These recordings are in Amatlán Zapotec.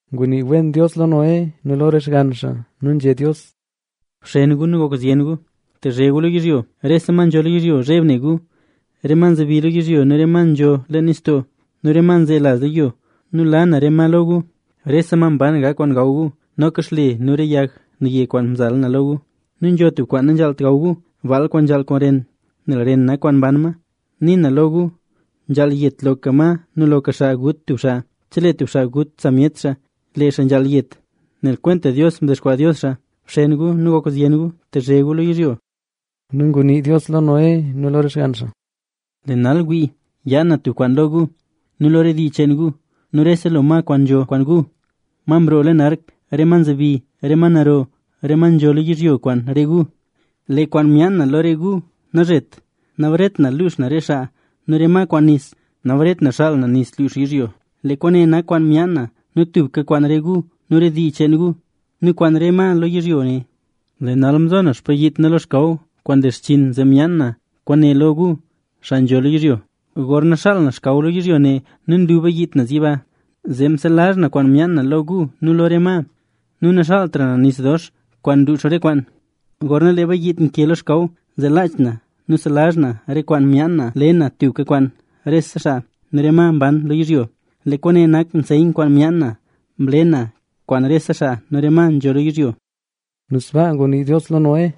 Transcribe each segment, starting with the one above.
Ngunii wen Dios lo Noé nu lo re xgann xaa nu nzhé Dios: —Bxen gu nu gok zyen gu, tezhe gu lo yizhyo. Rese ma nzho lo yizhyo zheb ne gu, rese ma nzebi lo yizhyo nu re ma nzho leen nistoo nu re ma nzelaz lo yo. Nu la na re ma lo gu. Rese ma mban gak kwaan gaw gu, noka xle nu re yag naye kwaan mzala na lo gu. Nu nzho tub kwaan nanzhaalt gaw gu, baal kwaan nzhaal ren, nel ren nak kwaan mban ma. Nii na lo gu, nzhaal yet loka ma nu loka xaa gut tub xaa. Chelee tub xaa gut samyet xaa, lee xaa nzhaal yet, nel kwenta Dios mdexkwaa Dios xaa. Bxen gu nu gok zyen gu, tezhe gu lo yizhyo. Nu ngunii Dios lo Noé nu lo re xgann xaa: —Lee nal wii, yaan na tub kwaan lo gu, nu rese lo ma kwaan nzho kwaan gu, ma mroo leen ark, re ma nzebi, re ma naro, re ma nzho lo yizhyo kwaan re gu. Lee kwaan yaan na lo re gu nazhet, nabaret na luux na re xaa nu re ma kwaan nis. Nabaret na xaal na nis luux yizhyo. Lee kwaane nak kwaan myaan na tubka kwaan re gu nu re dii cheen gu, nu kwaan re ma lo yizhyo ne. Lee nal mzo na xpayiit na lo xkaw, kwaan nle xchinn zee myaan na kwaane lo gu, xaa nzho lo yizhyo. Gorna xaal na xkaw lo yizhyo ne nu nlu bayiit naz yiba, zee selazh na kwaan myaan na lo gu nu lo re ma nu naxaaltra na nis dox kwaan luux re kwaan. Gorna lee bayiit nke lo xkaw, zee laach na nu selazh na re kwaan myaan na le na tubka kwaan rese xaa nu re ma mban lo yizhyo. Lee kwaane nak nseyn kwaan myaan na mle na kwaan rese xaa nu rese ma nzho lo yizhyo. Nu sbaa ngunii Dios lo Noé.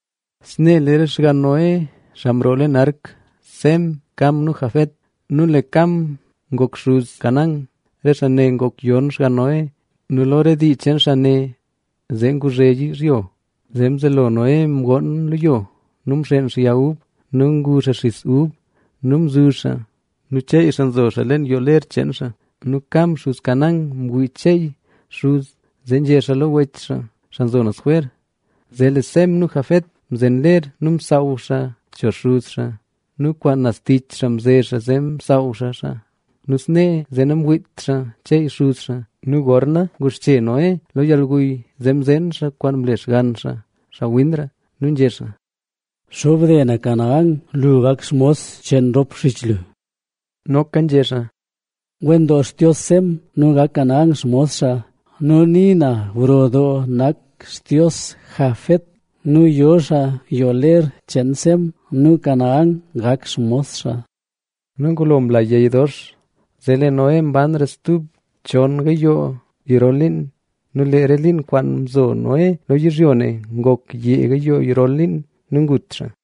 Snee lee re xgann Noé, xaa mroo leen ark: Sem, Cam nu Jafet. Nu lee Cam ngok xuz Canaán. Re xaa ne ngok yon xgann Noé nu lo re dii cheen xaa ne zee nguzhe yizhyo. Zee mzelo Noé mgoon lo yo nu mxeen xaa yag ub. Nu ngu xaa xisa nu mzuzh xaa. Nu cheey xaa nzo xaa leen yoo ler cheen xaa. Nu Cam, xuz Canaán, mwii cheey xuz xaa, zee nzhé xaa lo rop wech xaa, xaa nzo naz jwer. Zee lee Sem nu Jafet mzen ler nu msaaw xaa cho xuz xaa. Nu kwaan naz tich xaa mze xaa zee msaaw xaa xaa; nu snee zee namwiit xaa cheey xuz xaa. Nu gorna nguxche Noé lo yalguy zee mzeen xaa kwaan mle xgann xaa, xaa winra. Nu nzhé xaa: —Xobde na Canaán, Lu gak xmos cheen rop xich lu. Noka nzhé xaa: —Wen doo Xtios Sem, nu gak Canaán xmos xaa. Nu nii na gro doo nak Xtios Jafet, nu yo xaa yoo ler cheen Sem; nu Canaán gak xmos xaa. Nu ngulo mla yey dox zee lee Noé mbanra stub chon gayoo garol liin. Nu lee re liin kwaan mzo Noé lo yizhyo ne ngok yee gayoo garol liin. Nu ngut xaa.